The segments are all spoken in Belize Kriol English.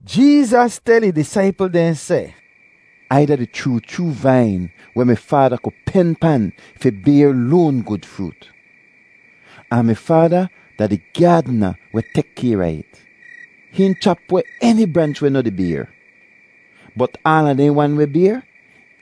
Jeezas tel ih disaipl dehn seh, “Ai da di chroo chroo vain weh mi Faada ku pen pan fi bayr loan gud froot, ahn mi Faada da di gyaadna weh tek kayr a it. Hihn chap weh eni branch weh noh di bayr, bot aala dehn wan weh bayr,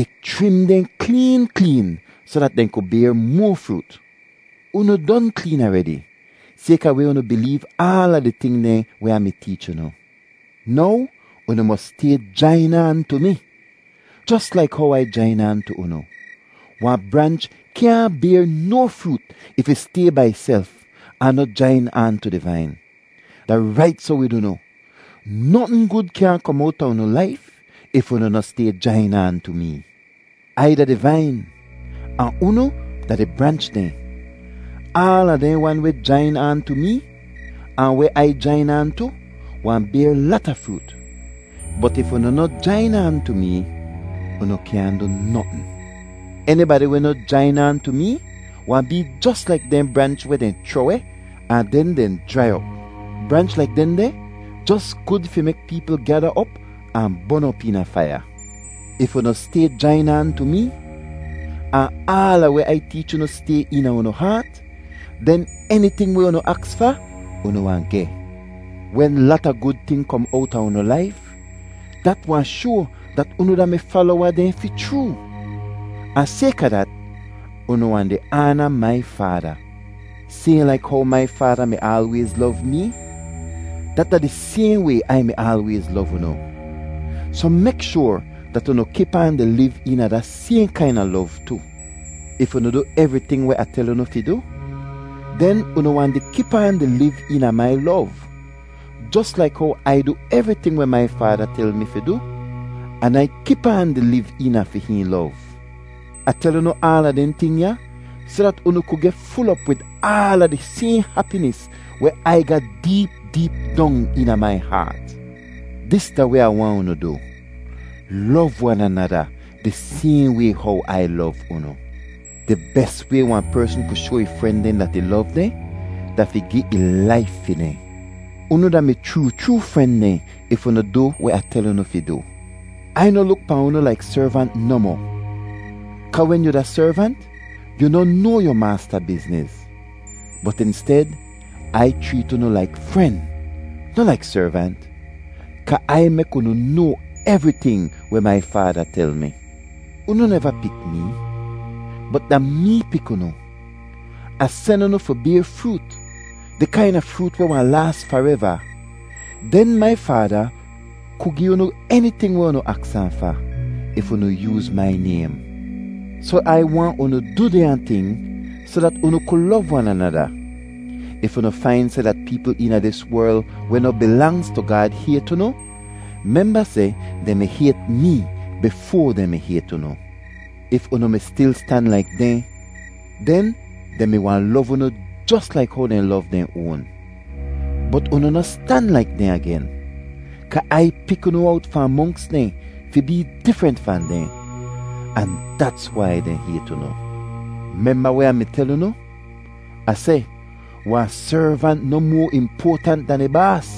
ih chrim dehn kleen kleen soh dat dehn ku bayr moa froot. Unu don kleen aredi sayka weh unu bileev aala di ting dehn weh Ah mi teech unu. Now unu mos stay jain aan tu mi, jos laik how Ai jain aan tu unu. Wahn branch kyaahn bayr no froot if ih stay bai ihself ahn noh jain aan tu di vain. Da rait soh wid unu: notn gud kyaahn kom owta unu laif if unu noh stay jain aan tu mee. “Ai da di vain ahn unu da di branch dehn. Aala dehn wan weh jain aan tu mee, ahn weh Ai jain aan tu, wahn bayr lata froot. Bot if unu noh jain aan tu mee, unu kyaahn du notn. Enibadi weh noh jain aan tu mee wahn bee jos laik dehn branch weh dehn chroh-weh ahn den dehn jrai op. Branch laik dehndeh jos gud fi mek peepl gyada op ahn bon op eena faiya. If unu stay jain aan tu mee, ahn aala weh Ai teech unu stay eena unu haat, den eniting weh unu aks fa, unu wahn geh. Wen lata gud ting kom owta unu laif, dat wahn shoa dat unu da mi falowa dehn fi chroo, ahn sayka dat, unu wahn di aana mai Faada. “Sayhn laik how mai Faada mi aalwayz lov mee, dat da di sayhn way Ai mi aalwayz lov unu; soh mek shoar dat unu kip aan di liv eena da sayhn kaina lov tu. If unu du evriting weh Ah tel unu fi du, den unu wahn di kip aan di liv eena mai lov, jos laik how Ai du evriting weh mai Faada tel mi fi du an Ai kip aan di liv eena fi hihn lov. Ah tel unu aala dehn ting ya soh dat unu ku geh ful op wid aala di sayhn hapinis weh Ai ga deep deep dong eena mai haat. “Dis da weh Ah waahn unu du: Lov wan anada di sayhn way how Ai lov unu. Di bes way wahn persn ku shoa ih fren dehn dat ih lov dehn da fi gi ih laif fi dehn. Unu da mi chroo chroo fren dehn if unu du weh Ah tel unu fi du. Ai noh luk pahn unu laik servant nohmoh kaa wen yu da servant, yu noh noa yu maasta bizniz. Bot insted, Ai chreet unu laik fren, noh laik servant, kaa Ai mek unu noa evriting weh mai Faada tel mi. “Unu neva pik mee, bot da mee pik unu. Ah sen unu fi bayr froot, di kaina froot weh wahn laas fareva. Den mai Faada ku gi unu eniting weh unu aks ahn fa if unu yooz mai naym. Soh Ai waahn unu du dehnya ting soh dat unu ku lov wan anada. “If unu fain seh dat peepl eena dis werl weh noh bilangz tu Gaad hayt unu, memba seh dehn mi hayt mee bifoa dehn mi hayt unu. If unu mi stil stan laik dehn, den dehn mi wahn lov unu jos laik how dehn lov dehn oan. Bot unu noh stan laik dehn agen, kaa Ai pik unu owt fahn monks dehn fi bee difrent fahn dehn, ahn dats wai dehn hayt unu. Memba weh Ah mi tel unu? Ah seh, ‘Wahn servant noh moa impoatant dan ih baas.’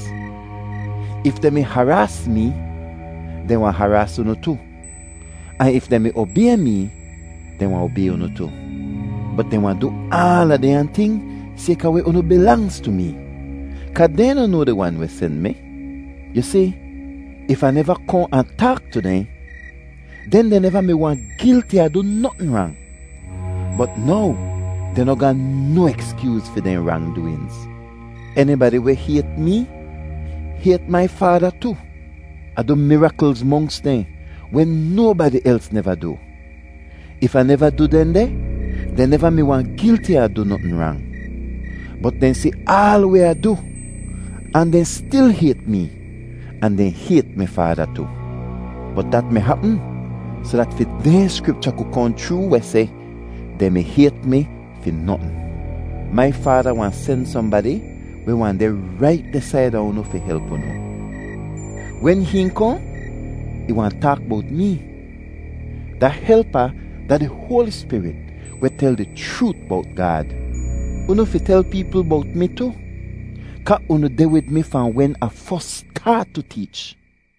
If dehn mi haraas mee, dehn wahn haraas unu tu. Ahn if dehn mi obay mee, dehn wahn obay unu tu. Bot dehn wahn du aala dehnya ting sayka weh unu bilangz tu mee, kaa dehn noh noa di Wan weh sen mi. Yu si, if Ah neva kohn ahn taak tu dehn, den dehn neva mi wahn gilti a du notn rang, bot now dehn noh ga no ekskyooz fi dehn rangdooinz. “Enibadi weh hayt mee hayt mai Faada tu. Ah du miraklz monks dehn weh nobadi els neva du. If Ah neva du dehndeh, dehn neva mi wahn gilti a du notn rang. Bot dehn si aal weh Ah du ahn dehn stil hayt mee ahn dehn hayt mi Faada tu. Bot dat mi hapm soh dat fi dehn Skripcha ku kohn chroo weh seh, ‘Dehn mi hayt mi fi notn.’ “Mai Faada wahn sen sohnbadi weh wahn deh rait deh saida unu fi help unu. Wen hihn kohn, ih wahn taak bowt mee. Da Helpa da di Hoali Spirit weh tel di chroot bowt Gaad. Unu fi tel peepl bowt mi tu, kaa unu deh wid mi fahn wen Ah fos staat tu teech.